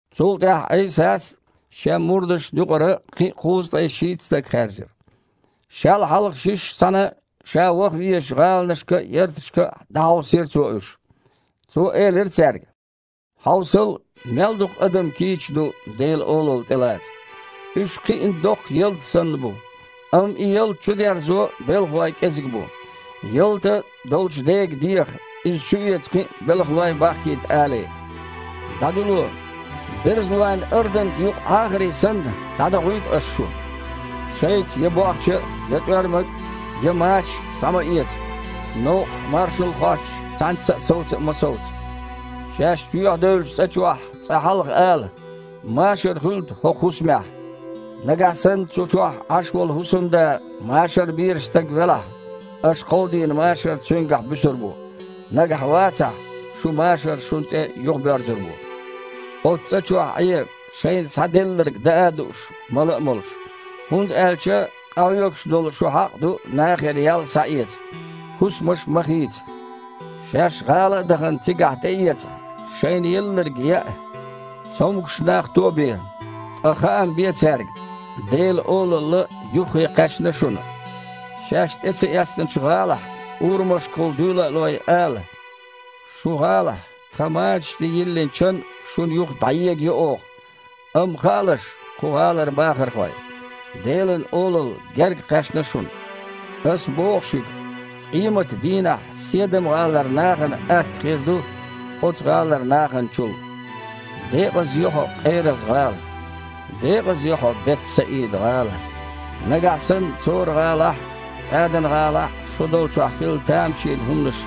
Цул тІаьхьа Іийсас Шен мурдашна юкъара кхин а кхузткъе шийтта стаг хаьржира. Шел хьалха шишша цхьаьна Ша ваха везачу гІаланашка а, ярташка а дІахьовсийра Цо уьш. Цо элира цаьрга: «Хьовсал, мел дукха адам кийча ду Делан Олалла тІелаца. Уьш кхиъна доккха ялта санна бу, амма и ялта чудерзо белхалой кІезиг бу. Ялта долчу Дега деха иза чуэца кхин а белхалой бахкийта алий. ДІадуьло! Берзалойн арданга юкъа Іахарий санна, дІадохуьйту Ас шу. Шайца я бохча а, я тІоьрмаг а, я мачаш а схьа ма эца, новкъахь маршалла хоттуш цхьаьнцца а совца а ма совца. Шаьш чоьхьадевллачу цІа чохь цкъа хьалха ала: „Машар хуьлда хІокху хІусамехь!“ Нагахь санна цу чохь Іаш волу хІусамда машар безаш стаг велахь, аш кховдийна машар цуьнгахь буьсур бу, нагахь вацахь – шун машар шуна тІе юхабоьрзур бу. Оцу цІа чохь Іе, шайна схьаделларг даа а дууш, мала а молуш, хІунда аьлча къахьоьгуш долу шу хьакъ ду нахера ял схьаэца. ХІусамаш ма хийца. Шаьш гІала а дахана, цигахь тІеэцахь, шайна елларг яа, цомгуш нах тобе, ткъа хаам бе цаьрга: „Делан Олалла юххе кхаьчна шуна!“ Шаьш тІе ца эцначу гІалахь, урамашкахула дуьйла а лой, ала: „Шун гІалахь тхан мачаш тІе йиллина чан а шуна юха дІаегайо оха. Амма хаалаш, кху гІалара бахархой: Делан Олалла гергакхаьчна шуна!“ Ас боху шуьга: къематан дийнахь Седам-гІалара нахана атта хир ду оцу гІалара нахана чул». «Декъаза ю хьо, Къераз-гІала! Декъаза ю хьо, Бет-Саида-гІала! Нагахь санна Цора-гІалахь а, ЦІадан-гІалахь а шу долчохь хилла тамашийна хІуманаш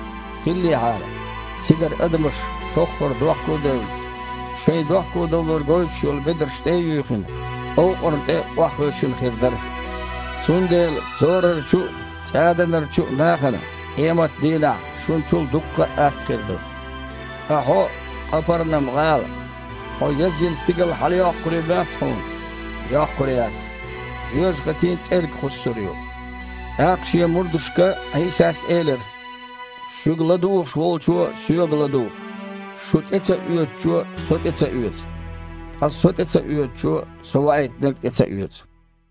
хиллехьара, цигара адамаш, тоххарехь дохко а девлла, шайн дохкодовлар гойтуш йолу бедарш тІе а юьйхина, овкъарна тІе охьахевшина хир дара. Цундела Цорарчу а, ЦІаданарчу а нахана къематан дийнахь шуна чул дуккха а атта хир ду. Ткъа хьо, Къапарнам-гІала, хьо язйина стигала хьалайоккхур ю моьтту хьуна? Йоккхур яц, жоьжахатин цІерга кхуссур ю». ТІаккха Шен мурдашка Іийсас элира: «Шуьга ладугІуш волчо Соьга ладугІу, шу тІе ца оьцучо Со тІе ца оьцу. Ткъа Со тІе ца оьцучо Со Ваийтинарг а тІе ца оьцу».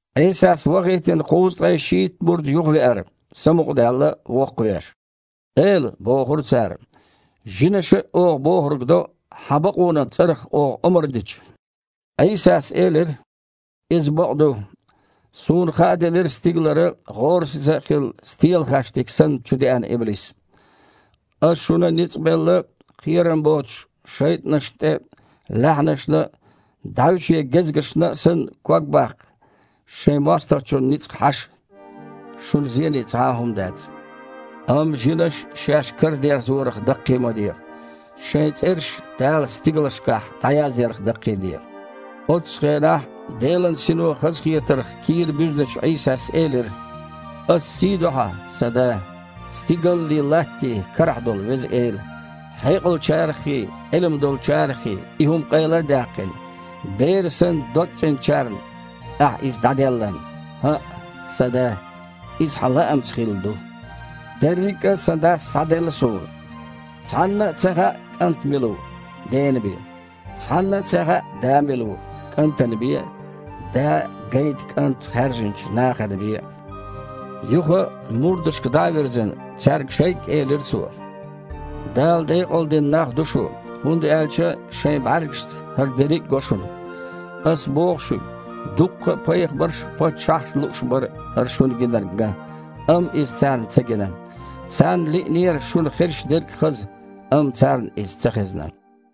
Іийсас вахийтина кхузткъе шийтта мурд юхавеара, самукъадаьлла, воккхавеш. «Эла, – бохура цара, – жинаша а оха бохург до, Хьан бакъонан цІарах оха омра дича». Іийсас элира: «Иза бакъ ду, Суна хааделира стигалара, гІорасиза а хилла, стелахаьштиг санна, чудеана иблис. Ас шуна ницкъ белла, кхерам боцуш, шайтІанашна тІе, лаьхьанашна а, дІаьвше гезгашна а санна, ког баккха, шайн мостагІчун ницкъ хьаша. Шуна зене цхьа а хІума дац. Амма жинаш шаьш карадерзорах даккхий ма де, шайн цІераш Дала стигалшкахь дІаязъярх даккхийде». Оццу хенахь Делан Сино хазахетарх кийра буьзначу Іийсас элира: «Аса сий до Хьан, Сан Да, стигаллий, Латтий карахь долу Веза Эла, хьекъалчараххий, Іилма долчараххий и хІума къайла а даьккхина, бер санна, догцІеначарна Ахьа иза дІаделларна. ХІаъ, Сан Да, иза Хьан лаамца хилла ду! Дерриг а Сан Дас схьаделла Суна. Цхьанна а ца хаьа КІант мила ву, Дена бен, цхьанна а ца хаьа Да мила ву, КІантана бен а, Да гайта КІанта хаьржинчу нахана бен а». Юха, мурдашка дІа а вирзина, цаьрга шайгга элира Цо: «Дала декъалдина нах ду шу, хІунда аьлча шайн бІаьргашца хІара дерриг а го шуна. Ас боху шуьга: дуккха а пайхамарш а, паччахьаш а лууш бара хІара шуна гинарг ган, амма иза царна ца гина. Царна лиънера шуна хезаш дерг хаза, амма царна иза ца хезна».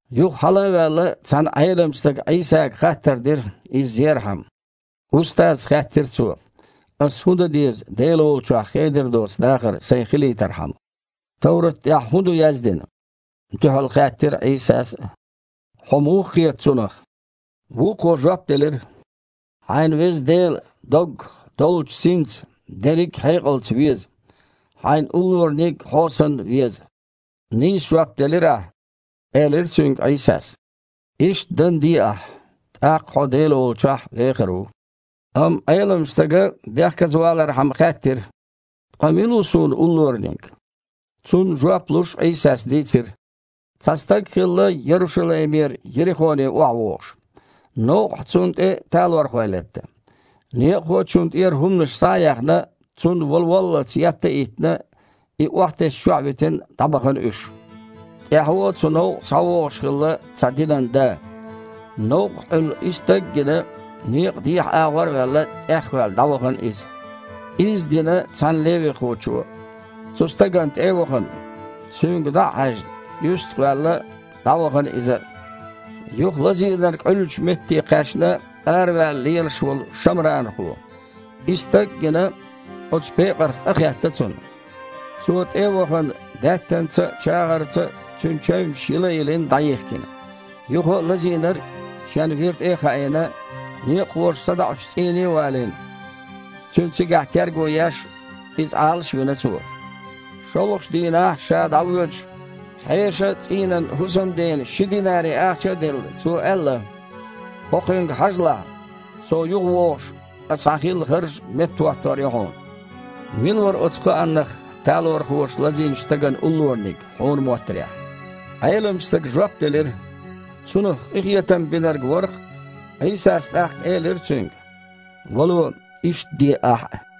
Юха, хьалха а ваьлла, цхьана Іеламчу стага Іийсага хаттар дира, Иза зерхьама. «Устаз, – хаьттира цо, – ас хІун дан деза, Дела волчохь хедар доцу дахар сан хилийтархьама?» «Товрат тІехь хІун ду яздина? – дуьхьал хаьттира Іийсас а. – Хьо муха кхета цунах?» Вукхо жоп делира: «„Хьайн Веза Дела доггах, доллучу синца, дерриг а хьекъалца веза“, „Хьо санна веза хьайна уллораниг а“». «Нийса жоп делира ахь, – элира цуьнга Іийсас, – иштта дан а де ахь, тІаккха хьо Дела волчохь вехар ву». Амма Іеламчу стага бехказа валархьама хаьттира: «Ткъа мила ву суна уллораниг?» Цунна жоп луш Іийсас дийцира: «Цхьа стаг хилла Ярушалаймера Ерихоне охьавогІуш. Новкъахь цунна тІе талорхой летта. Некъахочунна тІера хІуманаш схьа а яьхна, цунна вала воллалц етта а йиттина, и охьатесначохь а витина, дІабахана уьш. ТІаьхьо цу новкъа схьавогІуш хилла цхьа динан да. Новкъахь Іуьллу и стаг а гина, некъан дехьа агІор а ваьлла, тІехваьлла дІавахана иза. Изза дина цхьана левихочо, юьстахо а ваьлла, дІавахана иза а. Юха лазийнарг Іуьллучу метте кхаьчна араваьлла лелаш волу шамранхо. И стаг а гина, оцу пекъарх къахийтира цунна. Цо, тІе а вахана, даьттанца а, чагІарца а цуьнан чевнаш йила а йилина, дІайихкина. Юха лазийнарг шен вира тІе а хаийна, некъахоша садоІучу цІийне а валийна, цуьнан цигахь терго еш, иза Іалаш а вина цо. ШолгІачу дийнахь, ша дІавоьдуш, хьешан цІийнан хІусамдена ши динари ахча а делла, цо аьлла: „ХІокхуьнга хьажалахь, со юхавогІуш, ас хьан хилла харж меттахІоттор ю хьуна“. Мила вара оцу кхааннах талархоша лазийначу стагана уллораниг, хьуна моттарехь?» Іеламчу стага жоп делира: «Цунах къинхетам бинарг вара-кх». Іийсас тІаккха элира цуьнга: «ДІа а гІой, иштта де ахь а».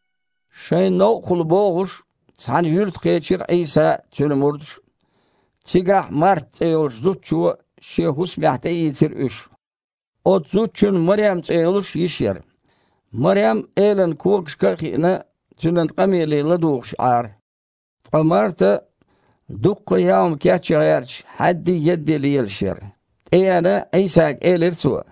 Шайн новкъахула богІуш, цхьана юьрта кхечира Іийса а, Цуьнан мурдаш а. Цигахь Марта цІе йолчу зудчо шен хІусамехь тІеийцира уьш. Оцу зудчун Марем цІе йолуш йиша яра. Марем, Элан когашка а хиина, Цуьнан къамеле ладугІуш Іара. Ткъа Марта, дуккха а яа хІума кечъян гІерташ, хьаьддий, еддий лелаш яра. ТІееана, Іийсага элира цо: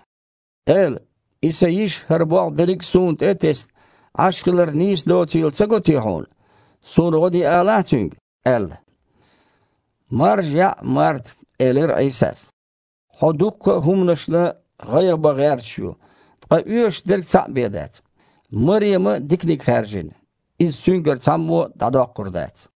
«Эла! И сан йиша, хІара болх берриг а суна тІе а тесна, Іаш хилар нийса доцийла ца го Хьуна? Суна гІо де алахьа цуьнга», – аьлла. «Маржа яІ, Марта, – элира Іийсас, – хьо дуккха а хІуманашна гІайгІа бан гІерташ ю, ткъа оьшушдерг цхьаъ бен дац. Марема диканиг хаьржина, иза цуьнгара цхьаммо а дІадоккхур дац».